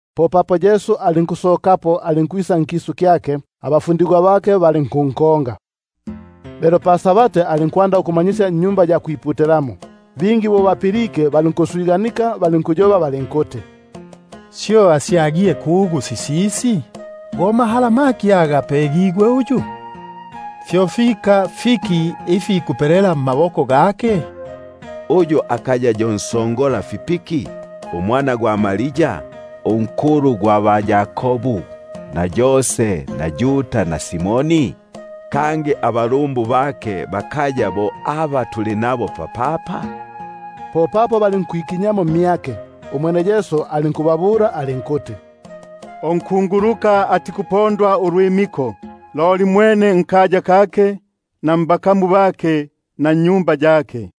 Popapo alinkusokapo, alinkwisa nkisu kyake, naba- fundigwa bake balinkunkonga. Lelo pa-Sabati alinkwanda ukumanyisya mu-Sinagogi. Bingi bo bapilike, balinkuswiganika balinkuti: Syo asyagile kugu sisisi? Go mahala maki aga apegigwe uyu? Buno nifika ifikulumba ikufipela mmaboko gake! Uyu akaya yo nsongolafipiki, umwana gwa Maria, unkulu gwa ba-Yakobu na Yose na Yuda na Simoni? Kangi abalumbu bakaya bo aba tuli nabo papapa? Popapo balinkwikinya mmyake. Umwene Yesu alinkubabula alinkuti: Unkunguluka atikupondwa ulwimiko, loli mwene nkaya kake, na mbakamu bake, na nnyumba yake.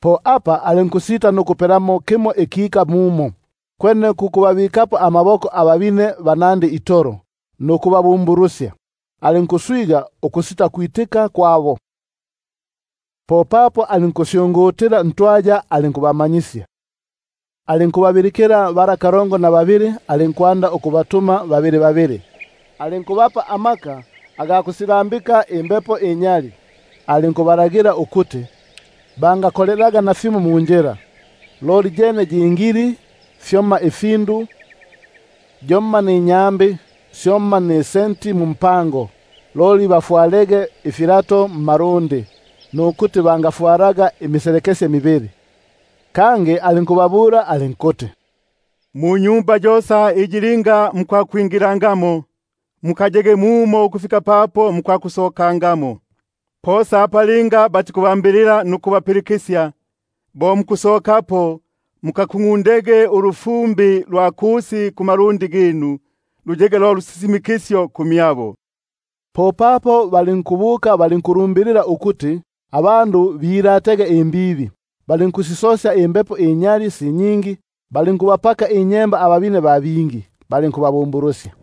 Po apa alinkusita nukupelamo kimo ikika mumo, kwene ku kubabikapo amaboko ababine banandi itolo nukubabumbulusya. Alinkuswiga ukusitakwitika kwabo. Popapo alinkusyungutila ntwaya alinkumanyisya. Alinkubabilikila bala kalongo na babili, alinkwanda ukubatuma babili babili. Alinkubapa amaka ga kusilambika imbepo inyali, kangi alinkubalagila ukuti bangakolelaga nafimo munjila, loli yene yi ngili itolo; fyomma ifindu, yomma ninyambi, syomma nisenti mumpango; loli bafwalege ifipapa mmalundi, nukuti bangafwalaga imiselekesye mibili. Kangi alinkubabula alinkuti: Munyumba yosa iyi linga mukwakwingilamo, mukayege mumo ukufika papo mukwakusokangamo. Posa apa linga batikubambilila nukubapilikisya, bo mukusokapo mukakungʼundege ulufumbi lwa kusi kumalundi ginu, luyege lo lusisimikisyo kumyabo. Popapo balinkubuka, balinkwakulumbilila isya lupinduko, balinkusisosya imbepo inyali si nyingi, balinkubapaka inyemba ababine ba bingi, balinkubabumbulusya.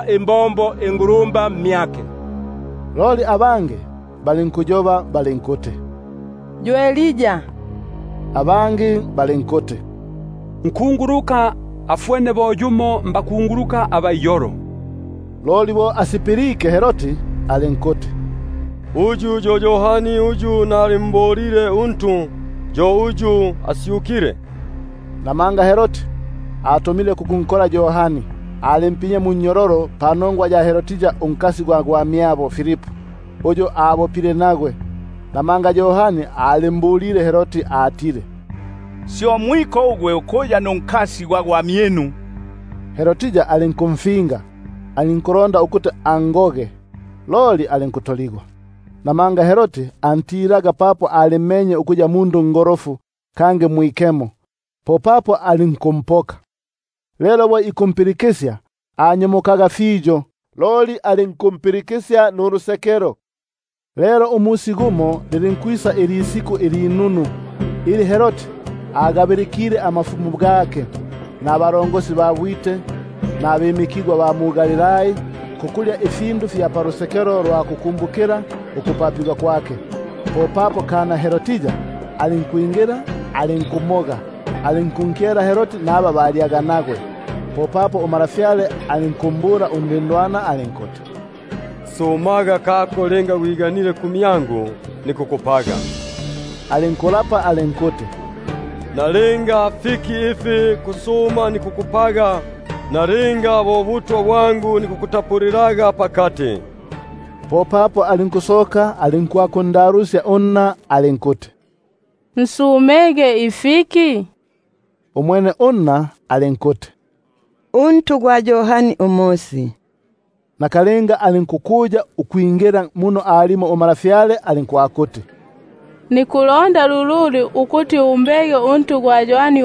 imbombo mmyake. Bamo balinkuti: Yo Elia, abangi balinkuti: Nkunguluka afwene bo yumo mbakunguluka. Loli bo asipilike Herodi alinkuti: Uyu yo Yohani uyu nali- mbolile untu, yo uyu asyukile. Namanga Herodi atumile kukunkola Yohani, alimpinyile munnyololo panongwa ya Herodia unkasi gwa gwamyabo Filipu; uyu abopile nagwe. Namanga Yohani alimbulile Herodi atile: Syo mwiko ugwe ukuya nunkasi gwa gwamyinu. Herodia alinkumfinga ukuti nimgoge, loli alinkutoligwa; namanga Herodi antilaga Yohani, papo alimmenye ukuya mundu ungolofu kangi mwikemo, popapo alinkumpoka. Lelo bo ikumpilikisya alinkunyomoka fiyo, loli alinkumpilikisya nulusekelo. Lelo lilinkwisa ilisiku ilinunu, ili Herodi agabilikile amafumu gake, nabalongosi ba bwite, nabimikigwa ba mu-Galilai, ku kulya ifindu fya palusekelo lwa kukumbukila ukupapigwa kwake. Popapo alinkwingila kana Herodia alinkumoga, alinkunkyela Herodi naba balyaga nagwe. Popapo untwa alinkumbula undindwana alinkuti: Sumaga aka gwiganile kumyangu, nikukupaga. Alinkuyigila alinkuti: Nalinga fiki ifi kusuma nikukupaga, nalinga nikukutapulila ubutwa bwangu pakati. Popapo alinkusoka alinkwakundalusya unna alinkuti: Nsumege fiki? Umwene alinkuti: Untu gwa Yohani Umosi. Nakalinga alinkukuya ukwingila muno alimo untwa alinkwakuti: Nikulonda ukuti lululu umbege untu gwa Yohani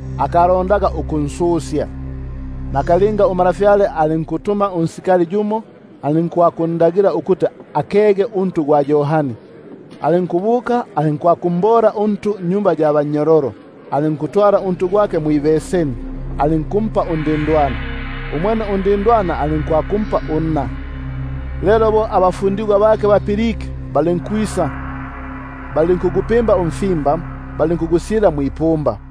akalondaga ukunsusya. Popapo untwa alinkuntuma yumo unsikali, alinkundagila ukuti akege untu gwake. Umwene alinkubuka alinkwakumbola untu nnyumba ya bannyololo; alinkutwala untu gwake mwibeseni, alinkumpa undindwana. Umwene undindwana alinkwakumpa unna. Lelo bo bapilike abafundigwa bake, balinkwisa, balinkugupimba umfimba balinkugubika mwipumba.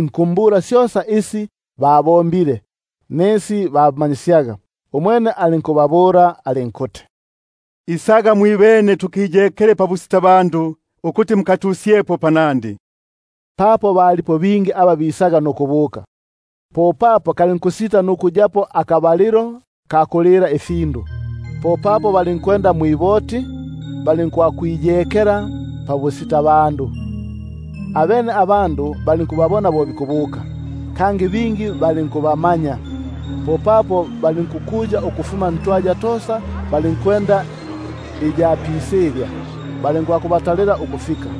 likumbula syosa isi babombaga nisi bamanyisyaga. Umwene alinkubabula alinkuti: Isaga mwibene tukiyekele pabusitabandu ukuti mukatusyepo panandi. Papo balipo bingi aba bisaga nukubuka, kalinkusita nukuyapo akabalilo ka kulila ifindu. Popapo balinkwenda mwiboti, balinkwakwiyekela pabusitabandu. Abene abandu balinkubabona bo bikubuka, bingi balinkubamanya; popapo balinkukuya ukufuma ntwaya tosa balinkwenda iya pisilya, balinkwakubatalila ukufika.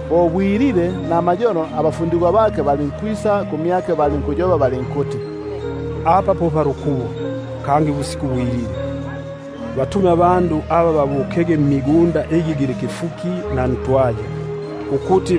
Bo ilisuba litembelile fiyo, abafundigwa bake balinkwisa kumyake balinkuti: Apa po palukubo, kangi ubusiku bwilile; basumusye babukege mumbali mmigunda na ntwaya, ukuti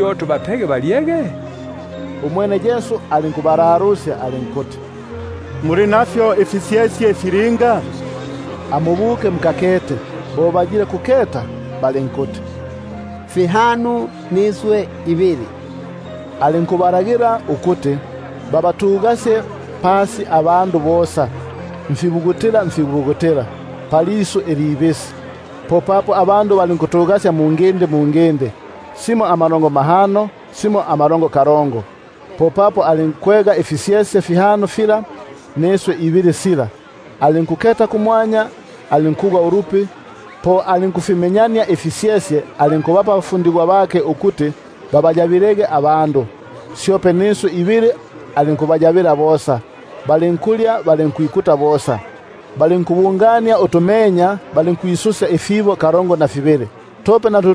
tubapege balyege? Umwene alinkubalalusya alinkuti: Muli nafyo ifisyesye filinga? Amubukege mukakete. Bo basya- genie balinkuti: Fihano, niswi ibili. Alinkubalagila ukuti babatugasye pasi bosa, mfibugutila mfibugutila, palisu ilibisi. Popapo balinkutugasya mungindi mungindi, simo amalongo mahano, simo amalongo kalongo. Popapo alinkwega ifisyesye fihano fila niswi ibili sha, alinkuketa kumwanya, alinkugwa ulupi, po alinkufimenyania ifisyesye, alinkubapa abafundigwa bake ukuti babayabaniege, syope niswi ibili alinkubayabania bosa. Balinkulya balinkwikuta bosa. Balinkubungania utumenya, balinkwisusya ifibo kalongo na fibili, tope na tu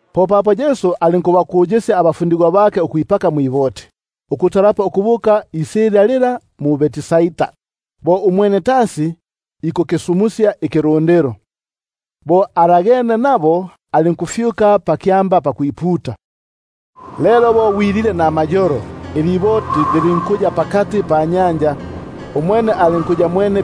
Popapo alinkubafimbilisya abafundigwa bake ukwipaka mwiboti, ukutalapo ukubuka isilya lila mu-Betsaida, bo umwene tasi ikukisumusya ikilundilo. Bo alagene nabo, alinkufyuka pakyamba pakwiputa. Lelo bo bwilile namayolo, iliboti lilinkuya pakati panyanja, umwene alinkuya mwene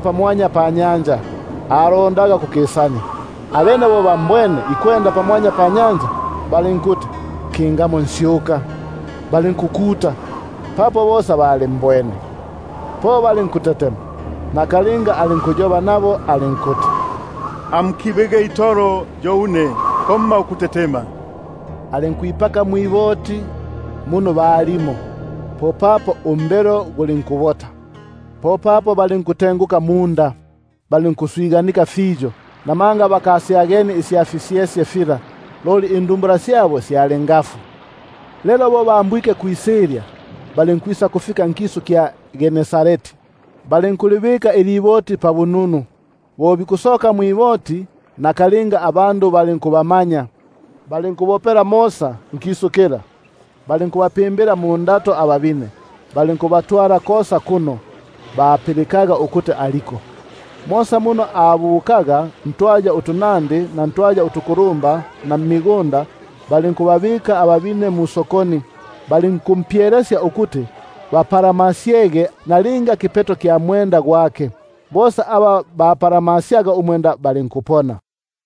pamwanya panyanja, alondaga ukukisania. Abene bo bambwene ikwenda pamwanya panyanja, balinkuti kingamo nsyuka, balinkukuta; papo bosa balimbwene, po balinkutetema. Nakalinga alinkuyoba nabo alinkuti: Amukibege itolo yo une, komma ukutetema. Alinkwipaka mwiboti muno balimo, popapo umbelo gulinkubota. Abene balinkutenguka munda, balinkuswiganika fiyo; namanga bakasyagenie isya fisyesye fila, loli indumbula syabo syali ngafu. Lelo bo bambwike kwisilya, balinkwakufika mu-Gene- sareti, balinkulibika iliboti pabununu. Bo bikusoka mwiboti, nakalinga abandu balinkummanya. Balinkubopela mosa nkisu kila, balinkwanda ukubapimbila mundato ababine, kosa kuno bapilikaga ukuti aliko. Mosa muno abukaga, ntwaya utunandi na ntwaya utukulumba na mmigunda, balinkubabika ababine musokoni; balinkumpyelesya ukuti bapalamasyege nalinga kipeto kya mwenda gwake; bosa aba bampalamasyaga balinkupona.